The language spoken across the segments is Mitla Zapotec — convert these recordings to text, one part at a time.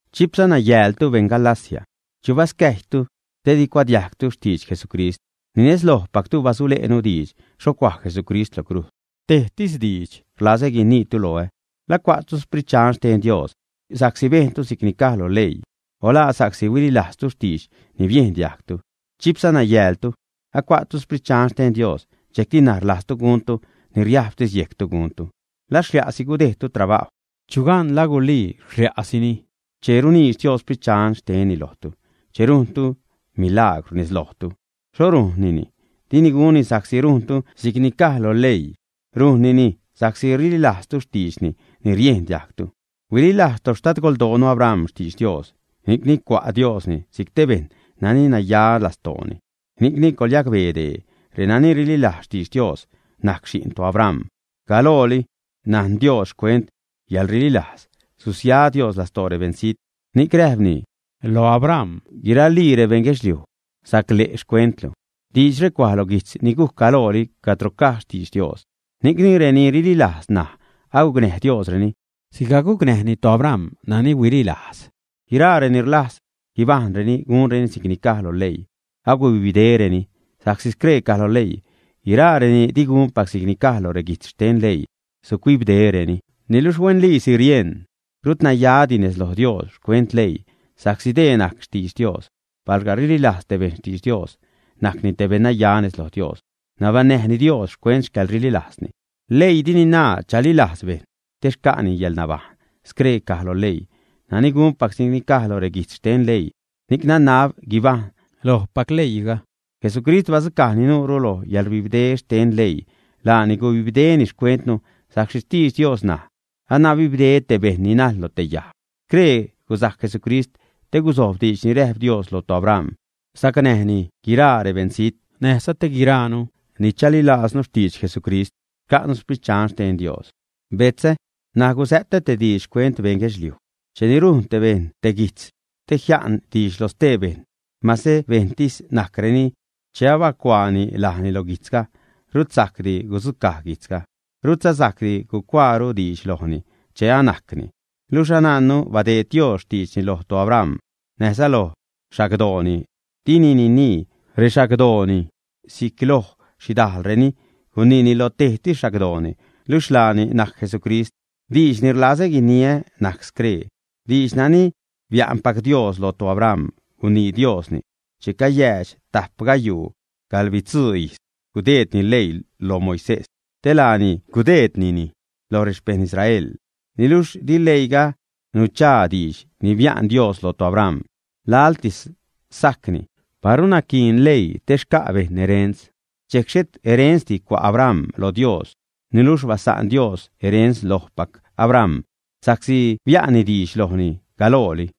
¡Chipsa nayäältu beṉ Galacia! ¿Chu bascäjytu te di cuadiajgtu xtidx Jesucrist? Ni nez lojpactu bisule'nu diidx xho cuaj Jesucrist lo crujz. Tejtis diidx rlazä guiniitu loä. ¿La cua'tu Sprit Dxan xten Dios sa'csi bejntu si'cni caj lo leii, ä? o ¿la sa'csi huililajztu diidx ni biejn diajgtu? Chipsa nayäältu. Acua'tu Sprit Dxan xten Dios dxejcti ṉaj rlajztu guntu ni riajbtis yejctu guntu. ¿La xlia'si gudejdtu trabajw? Chugan la gulii xlia'sini. Che runiidx Dios Sprit Dxan xtenni lojtu, che rujnni milaagwr nez lojtu, ¿xho rujnnini? Dini gunni sa'csi rujntu si'cni caj lo leii, rujnnini sa'csi rililajztu xtiidxni ni riejn diajgtu. Huililajz toxtadgoldoonu Abram xtidx Dios, ni'cni cua' Diosni si'c te bejṉ nani naya lastooni. Ni'cni coḻyacbee dee: renani rililajz xtiidx Dios najc xi'n toAbram. Galooli najn Dios xcuent yäḻrililajz susia Dios lastoo rebeṉzijt, ni'c räjpni lo Abram: “Guiralii rebeṉ guedxliuj sacle' xcuentlu.” Diidxre cuaj lo guijtz ni gujc galooli, cadro caj xtidx Dios. Ni'cni reni rililajz ṉaj agucnäj Diosreni sigajc gucnäjni toAbram nani huililajz. Guiraa reni rlajz guibajṉreni gunreni si'cni caj lo leii, agubibdereni sa'csi scree caj lo leii: “Guiraa reni digunpac si'cni caj lo reguijtz xten leii, sucuibdereni.” Niluxh huenliisi rieṉ rut nayadi nez loj Dios xcuent leii, sa'csi dee najc xtidx Dios: palga rililajz te bejṉ xtidx Dios, najcni te bennaya nez lo Dios, nabaṉnäjni Dios xcuent xcäḻrililajzni. Leii dini naa chalilajz bejṉ te xca'ni yäḻnabajṉ. Scree caj lo leii: “Nani gunpac si'cni caj loj reguijtz xten leii, ni'c nanab guibajṉ lojpac leiiga.” Jesucrist badzucaj nuure loj yäḻrbibde xten leii. Laani gubibdeni xcuentnu sa'csi xtidx Dios naj: “Anabibde te bejṉ ni najḻ loj te yajg.” Scree gusajc Jesucrist te gusojb diidx ni räjp Dios loj toAbram, sacnäjni guiraa rebeṉzijt; näjza te guiraanu ni chalilajznu xtidx Jesucrist xca'nu Sprit Dxan xten Dios. Betzä, ṉaj gusä'tä te diidx xcuent beṉ guedxliuj. Cheni rujn bejṉ te guijtz te jia'n diidx lo stee bejṉ, mase bejṉtis najcreni, che abacuaani lajni lo guijtzga, rut sajcdi gudzucaj guijtzga. Rutza sajcdi gucuaaru diidx lojni che anajcni. Luxh anajnnu badeed Dios xtiidxni loj toAbram näjza loj xagdooni. Dini ninii “rexagdooni” si'c loj xhidajlreni, guniini lo tejtis xagdooni, luxh laani najc Jesucrist. Diidx ni rlazä guiniä najc scree: Diidx nani bia'npac Dios loj toAbram gunii Diosni che cayäädx tajp gayuu gaḻbitzuu ijz gudeedni leii lo Moisés te laani gudeednini loj rexpejṉ Israel. Niluxh di leiiga nuchaa diidx ni bia'n Dios loj toAbram, laḻtis sajcni. Paru naquiin leii te xca' bejṉ erens, dxejc xhet erensdi cua' Abram lo Dios. Niluxh basa'n Dios erens lojpac Abram sa'csi bia'nni diidx lojni galooli.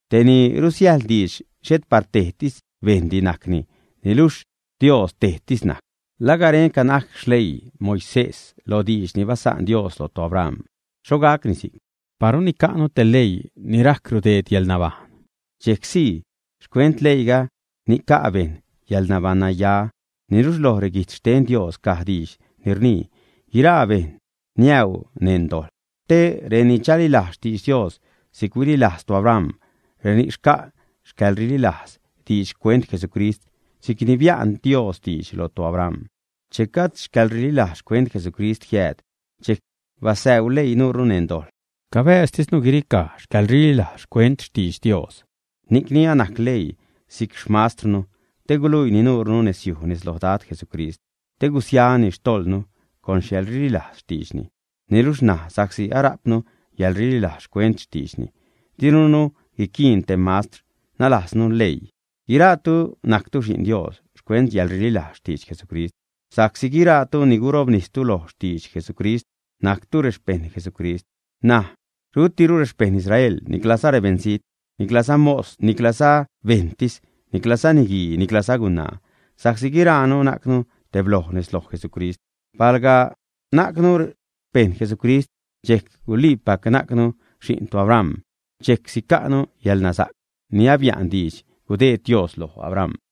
Te ni rusiäjḻ diidx xhet par tejtis bejṉdi najcni, niluxh Dios tejtis najc. ¿La garenca najc xleii Moisés lo diidx ni basa'n Dios loj toAbram, ä? ¡Xho gacni si'c! Paru nica'nu te leii ni rajc rudeed yäḻnabajṉ, dxejc sii xcuent leiiga nica' bejṉ yäḻnabaṉnaya. Niluxh loj reguijtz xten Dios caj diidx ni rnii: Guiraa bejṉ niäuu neṉ dojḻ, te reni chalilajz xtidx Dios si'c huililajz toAbram, reni'c xca' xcäḻrililajz diidx xcuent Jesucrist si'cni bia'n Dios diidx loj toAbram. Che gajd xcäḻrililajz xcuent Jesucrist jiääd, dxejc basäuu leii nuure neṉ dojḻ, cabäjztisnu guiricaj xcäḻrililajz xcuent xtidx Dios. Ni'cni anajc leii si'c xmastrnu te guluiini nuure nezyuj nez lo Dad Jesucrist te gusiani xtojḻnu con yäḻrililajz xtiidxni. Niluxh ṉaj sa'csi arajpnu yäḻrililajz xcuent xtiidxni, dirunu guiquiin te mastr, nalajznu leii. Guiraatu najctu xi'n Dios xcuent yäḻrililajz xtidx Jesucrist, sa'csi guiraatu ni gurobnistu loj xtidx Jesucrist, najctu rexpejṉ Jesucrist. N̲aj rutiru rexpeṉ Israel niclaza rebeṉzijt, niclaza mos, niclaza bejṉtis, niclaza niguii, niclaza gunaa, sa'csi guiraanu najcnu tebloj nez lo Jesucrist. Palga najcnu xpejṉ Jesucrist, dxejc guliipac najcnu xi'n toAbram, dxejc sica'nu yäḻnasa'c ni abia'n diidx gudeed Dios loj Abram.